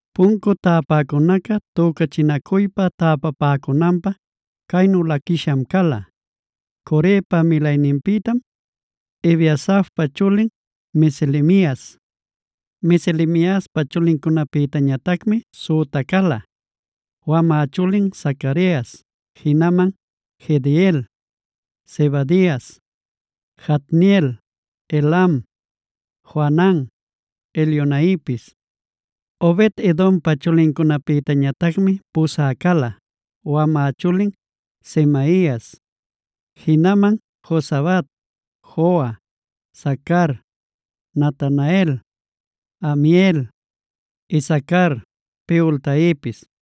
Puncu täpäcunaca tücachinacuypa täpapäcunanpä caynu laquisham cala: Corepa milayninpïtam Ebiasafpaa chulin Meselemias. Meselemiaspa chulincunapïtañatacmi süta cala: wamä chulin Zacarias, jinaman Jediael, Zebadias, Jatniel, Elam, Johanan, Elioenaipis. Obed-edompa chulincunapïtañatacmi pusä cala: wamä chulin Semaias, jinaman Jozabad, Joa, Sacar, Natanael, Amiel, Isacar, Peultaipis.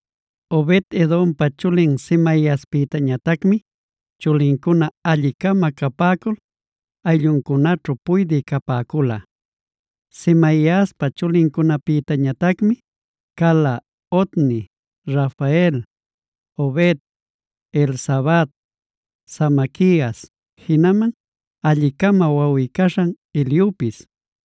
Obed-edompa chulin Semaiaspïtañatacmi chulincuna, alli-cama capäcul aylluncunaćhu puydï capäcula. Semaiaspa chulincunapïtañatacmi cala: Otni, Rafael, Obed, Elzabad, Samaquias, jinaman alli-cama wawꞌi-caśhan Eliupis.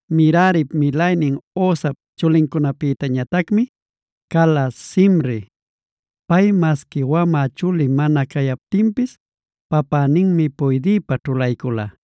Merarip milaynin Hosap chulincunapïñatacmi cala: Simri (pay masqui wamä chuli mana cayaptinpis papäninmi puydïpä ćhulaycula),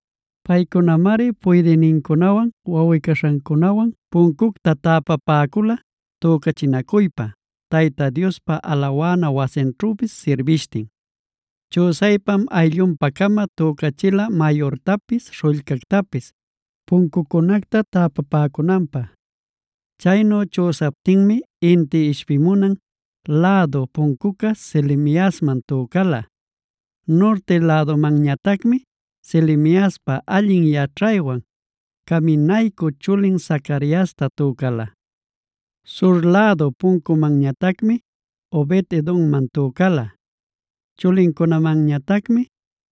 Paycunamari puydïnincunawan wawꞌi-caśhancunawan puncucta täpapäcula tücachinacuypa, Tayta Diospa alawana wasinćhüpis sirbishtin. Chüsaypam ayllunpa-cama tücachila mayurtapis śhullcactapis, puncucunacta täpapäcunanpä. Chaynu chüsaptinmi inti ishpimunan lädu puncuca Selemiasman tücala. Nurti lädumanñatacmi Selemiaspa allin yaćhaywan caminaycü chulin Zacariasta tücala. Sur lädu puncumanñatacmi Obed-edomman tücala. Chulincunamanñatacmi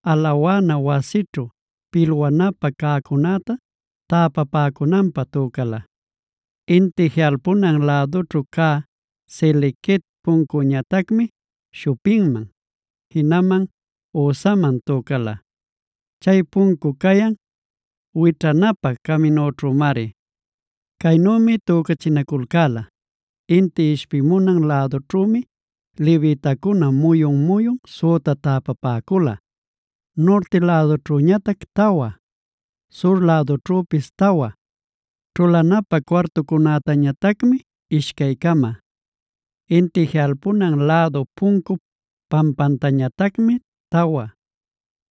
alawana wasićhu pilwanapä cäcunäta täpapäcunanpä tücala. Inti jiꞌalpunan lädućhu cä Salequet puncuñatacmi Shupimman, jinaman Hosaman tücala. Chay puncu cayan wićhanapä caminućhümari. Caynümi tücachinaculcäla: Inti ishpimunan lädućhümi levitacuna muyun-muyun süta täpapäcula: norte lädućhüñatac tawa, sur lädućhüpis tawa, ćhulanapä cuartucunätañatacmi ishcay-cama, inti jiꞌalpunan lädu puncup pampantañatacmi tawa,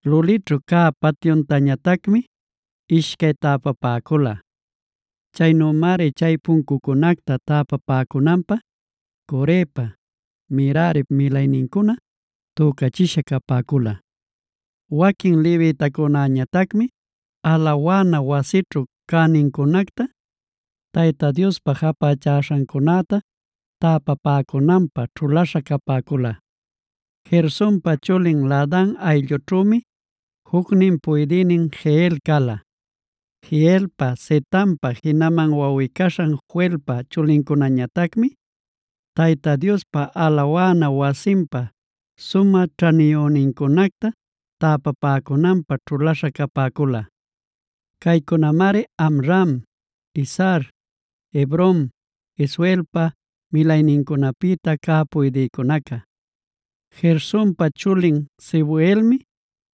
lulićhu cä patyuctañatacmi ishcay täpapäcula. Chaynümari chay puncucunacta täpapäcunanpä Corepa, Merarip milaynincuna tücachisha capäcula. Waquin levitacunañatacmi alawana wasićhu cänincunacta, Tayta Diospä japächaśhancunäta täpapäcunanpä ćhulaśha capäcula. Gersonpa chulin Laadan ayllućhümi, jucnin puydïnin Jehiel cala. Jehielpa, Zetampa, jinaman wawꞌi-caśhan Joelpa chulincunañatacmi Tayta Diospa alawana wasinpa sumä ćhaniyünincunacta täpapäcunanpä ćhulaśha capäcula. Caycunamari Amram, Izhar, Hebron, Uzielpa milaynincunapïta cä puydïcunaca: Gersonpa chulin Sebuelmi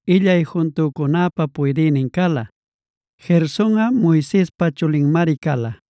illay juntücunäpa puydïnin cala. Gersonꞌa Moisespa chulinmari cala.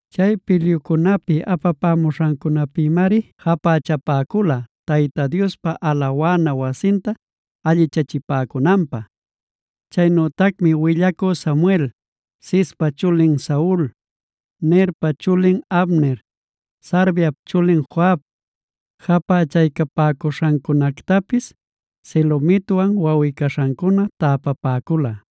Chay pilyucunapi apapämuśhancunapïmari japächapäcula, Tayta Diospa alawana wasinta allichachipäcunanpä. Chaynütacmi willacü Samuel, Cispa chulin Saul, Nerpa chulin Abner, Sarviap chulin Joab japächaycapäcuśhancunactapis Selomitwan wawꞌi-caśhancuna täpapäcula.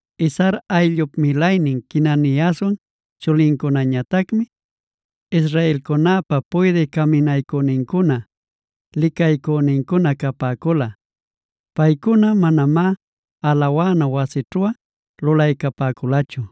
Izhar ayllup milaynin Quenaniaswan chulincunañatacmi israelcunäpa puydï caminaycünincuna, licaycünincuna capäcula. Paycuna manamá alawana wasićhuꞌa lulaycapäculachu.